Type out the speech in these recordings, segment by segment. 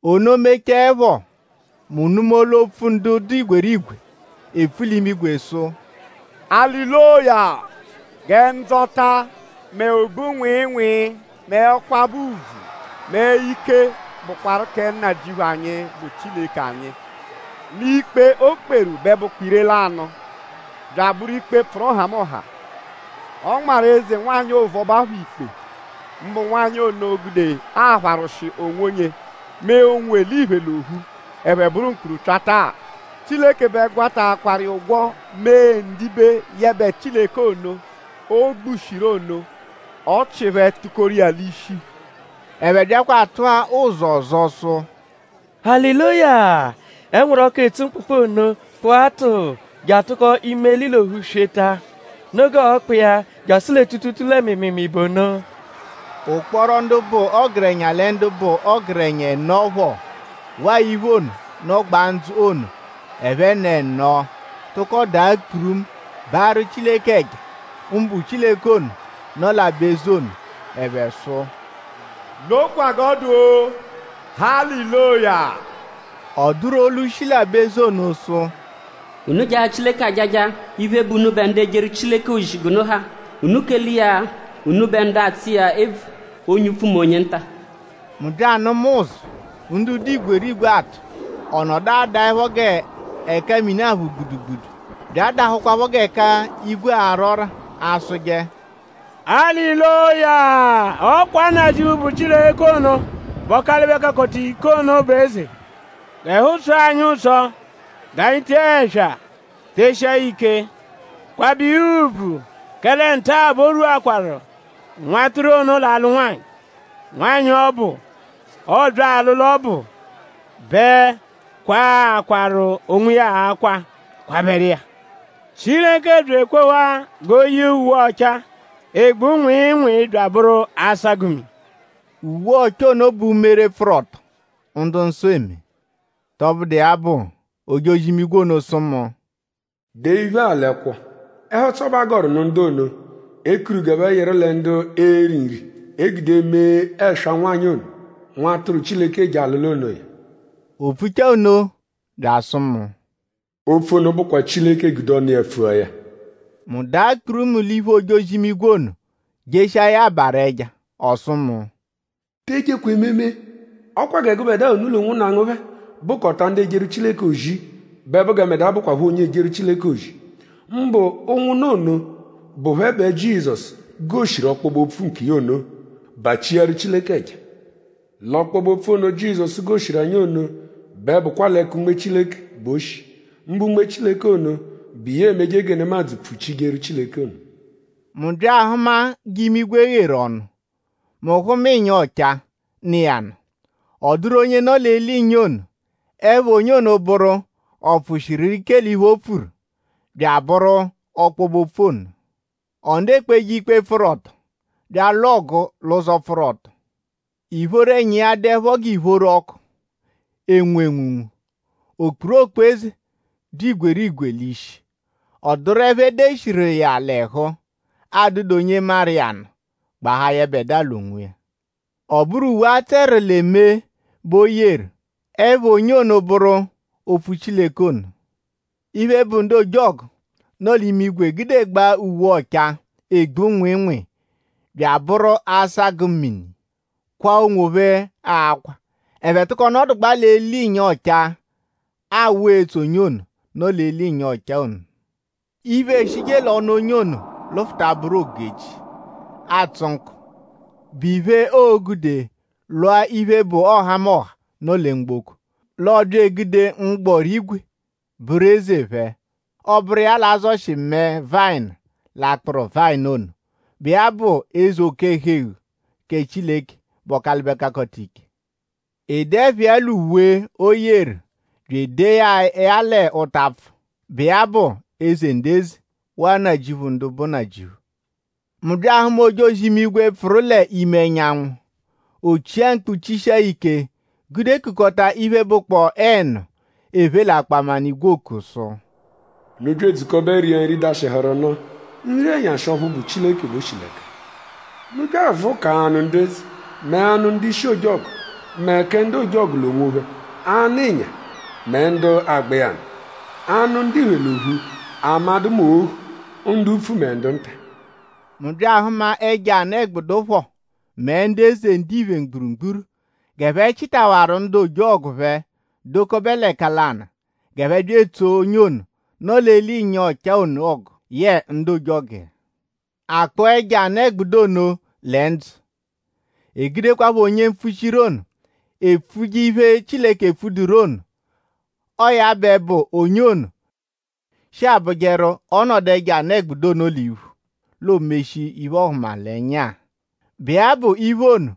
Ono mechaẹpho; mu nụma olu-opfu ndu dụ igwerigwe epfu l'imigwe sụ: “Aliloya! Gẹ ndzọta; mẹ ogbu-nwịinwii; mẹ ọkwabe ùbvù; mẹ ike; bụkwaru kẹ Nnajịuphu anyi, bụ Chileke anyi! L'ikpe, o kperu bẹ bụkwa ire-lanụ; bya abụru ikpe, pfụru nhamụnha. Ọ nmarụ eze-nwanyị ovuọba phọ ikpe; mbụ nwanyị ono, gude apharwụshi onwonye mee ụnwu-eliphe l'ophu: ẹphe bụru mkpurupyata-a. Chileke bẹ gwataakwaru iya ụgwo mee ndibe yẹbe Chileke ono, o gbushiru ono. Ọchi phẹ tukoru iya l'ishi.” Ẹphe byakwa atụa ụzu ọzo sụ: “Aliloya! Ẹnwuru-ọku, etsu mkpụkpu ono kpụa tụuu je atụko imeli l'ophu sweta. Noo g'ọo-kpụ iya jasụ lẹ tuutuutuu lẹ mịimiimii bụ ono.” Ụkporo ndu bụ ọgerenya lẹ ndu bụ ọgerenya ẹno phọ; waa iphe ono, nọgbaa ndzụ ono ẹphen'ẹno tụko daa kpurumu baarụ Chileke ẹja; mbụ Chileke ono, nọ l'aba-eze ono. Ẹphe sụ: “Nokwa g'ọ dụ-o. Aliloya!” Ọ dụru olu, shi l'aba-eze ono sụ: “Unu jaa Chileke ajaja iphe, bụ unubẹ ndu ejeru Chileke ozi g'unu ha; unu kele iya unubẹ ndu atsụ iya ebvu; onye upfu mẹ onye nta.” Mu bya anụma ụzu, ndu dụ igwerigwe atụ. Ọ nọdu adaẹpho g'ẹka mini aphụ gbudugbudu; bya adahụkwapho g'ẹka igwe ara ọ́rà; asụje: “Aliloya! Ọ kwa Nnajịuphu, bụ Chileke ono, bụ Ọkalibe-Kakọta-Ike ono bụ Eze. G'ẹhu tsọo anyi ụtso; g'anyi tee ẹswa teshia ya ike; kwabẹ iya ùbvù; kẹle nta-a bẹ o rwuakwaru Nwatụru ono l'alụ nwanyị. Nwanyị ọbu, ọobya alụlu ọbu bẹ kwaakwaru onwiya akwa kwabẹru iya. Chileke bya ekwewa g'o yee uwe ọchaa, egbu nwịinwii bya abụru asagụ-mini.” Uwe ọchaa ono bụ umere pfụru ọto, ndu-nsọ eme. Tọbudu iya bụ; ojozi-imigwe ono sụ mu: “Dee iphe-a l'ẹkwo: ‘Ẹhu-ụtso bẹ a gọru nụ ndu ono, e kuru g'ẹphe yịru lẹ ndu e-ri nri, e gude eme ẹswa nwanyị ono, Nwatụru Chileke ono eje alụlu onoya.’” O pfuchaa nno bya asụ mu: “Opfu ono bụkwa Chileke gude ọnu iya pfua ya.” Mu daa kpurumu l'iphu ojozi-imigwe ono jeshiaru iya abarụ ẹja. Ọ sụ mu: “Te ejekwa ememe! Ọ kwa gẹ gụbedua unu l'ụnwunna ngu phẹ bụkota ndu ejeru Chileke ozi bẹ bụ gẹ mbẹdua bụkwapho onye ejeru Chileke ozi; mbụ ụnwunna ono, bụ phẹ bẹ Jizọsu goshiru ọkpobe-opfu nkiya ono. Bachiaru Chileke ẹja. L'ọkpobe-opfu ono, Jizọsu goshiru anyi ono bẹ bụkwa l'ẹka Unme Chileke bẹ o shi; mbụ Unme Chileke ono, bụ iya emeje gẹ nemadzụ pfuchijeru Chileke ono.” “Mu bya ahụma g'imigwe gheru ọnu. Mu hụma ịnya ọchaa, nọ iya nụ. Ọ dụru onye nọ l'eli ịnya ono. Ẹpha onye ono bụru: Ọ pfụshiru ike l'iphe, o pfuru”; bya abụru “Ọkpobe-Opfu ono.” Ọ nọdu ekpeje ikpe, pfụru ọto bya alwụ ọgu l'ụzo, pfụru ọto. Ìphóró ẹnya iya dụepho g'ìphóró ọku, enwu enwunwu. O kpuru okpu-eze, dụ igwerigwe l'ishi. Ọ dụru ẹpha, e deshiru iya l'ẹhu, adụdu onye maru iya nụ gbahaa yẹbedua l'onwiya. Ọ bụru uwe, a tsẹru lẹ mee bẹ o yeru. Ẹpha onye ono bụru “Opfu Chileke” ono. Iphe, bụ ndu ojọgu, nọ l'imigwe gudegbaa uwe ọchaa, egbu nwịinwii bya abụru asagụ-mini kwaa onwophẹ akwa. Ẹphe tụko nọdugbaa l'eli ịnya ọchaa awụ etso onye ono, nọ l'eli ịnya ọchaa ono. Iphe, eshije l'ọnu onye ono lụfuta bụru ogu-echi, atsụ nkọ, bụ iphe, oo-gude lwụa iphe, bụ ọhamoha, nọ lẹ mgboko. L'ọ bya egude mgbọrígwè bụru eze phẹ. Ọ bụru iya l'a-zọshi mẹe vayịnu l'akpụru vayịnu ono, bụ iya bụ eze oke-ẹhu-eghu kẹ Chileke, bụ Ọkalibe-Kakọta-Ike. E dee ẹpha iya l'uwe, o yeru bya edee ya ya l'ụtapfu, bụ iya bụ: “Eze ndu eze; waa Nnajịuphu ndu bụ nnajịuphu.” Mu bya ahụma ojozi-imigwe, pfụru l'ime ẹnyanwu. O chia mkpu chishia ya ike gude kukọta iphe, bụkpoo ẹnu, ephe l'akpaminigwe oku sụ: “Unu bya edzukọbe ria nri, dashịhuru unu; nri-ẹnyashi ọphu bụ Chileke bẹ o shi l'ẹka. Unu bya avụkaa anụ ndu eze; mẹ anụ ndu-ishi ojọgu; mẹ kẹ ndu ojọgu l'onwophẹ; anụ ịnya; mẹ ndu agba iya nụ; anụ ndiphe l'ophu; amadụ mẹ ohu; ndu upfu mẹ ndu nta.” Mu bya ahụma ẹjo anụ-ẹgbudu phọ mẹ ndu eze ndiphe mgburugburu g'ẹphe chịtawaru ndu ojọgu phẹ dọkobe l'ẹka lanụ g'ẹphe bya etsoo onye ono, nọ l'eli ịnya ọchaa ono ọgu yẹe ndu ojọgu iya. A kpụa ẹjo anụ-ẹgbudu ono lẹ ndzụ. E gudekwaphọ onye mpfuchiru ono, epfuje iphe, Chileke epfuduru ono. Ọo ya bẹ bụ onye ono, shi abụjeru: ọ -nọdu ẹjo anụ-ẹgbudu ono l'iphu; l'o meshia iphe-ọhumalenya-a, bụ iya bụ iphe ono,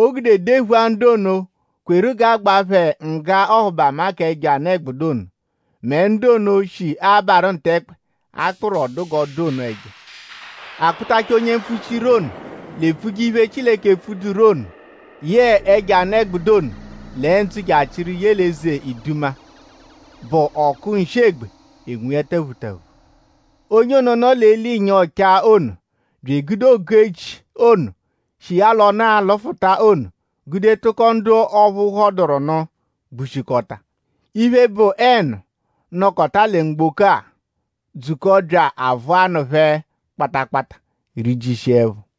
o gude dephua ndu ono, kweru g'a gbaa phẹ ngga ọhubama k'ẹjo anụ-ẹgbudu ono; mẹ ndu ono, shi abarụ ntẹkpe, a kpụru ọ dụ g'ọ dụ ono ẹja. A kpụtachaa onye mpfuchiru ono l'epfuje iphe, Chileke epfuduru ono yẹe ẹjo anụ-ẹgbudu ono lẹ ndzụ je achịru ye l'eze iduma, bụ ọku nshị-egbe enwu iya taphutaphu. Onye ono, nọ l'eli ịnya ọchaa ono bya egude ogu-echi ono, shi iya l'ọnu alụfuta ono gude tụko ndu ọphu phọduru nụ gbushikọta. Iphe, bụ ẹnu, nọkota lẹ mgboko-a dzukọo bya avụa anụ phẹ kpata kpata; rijishia ẹpho.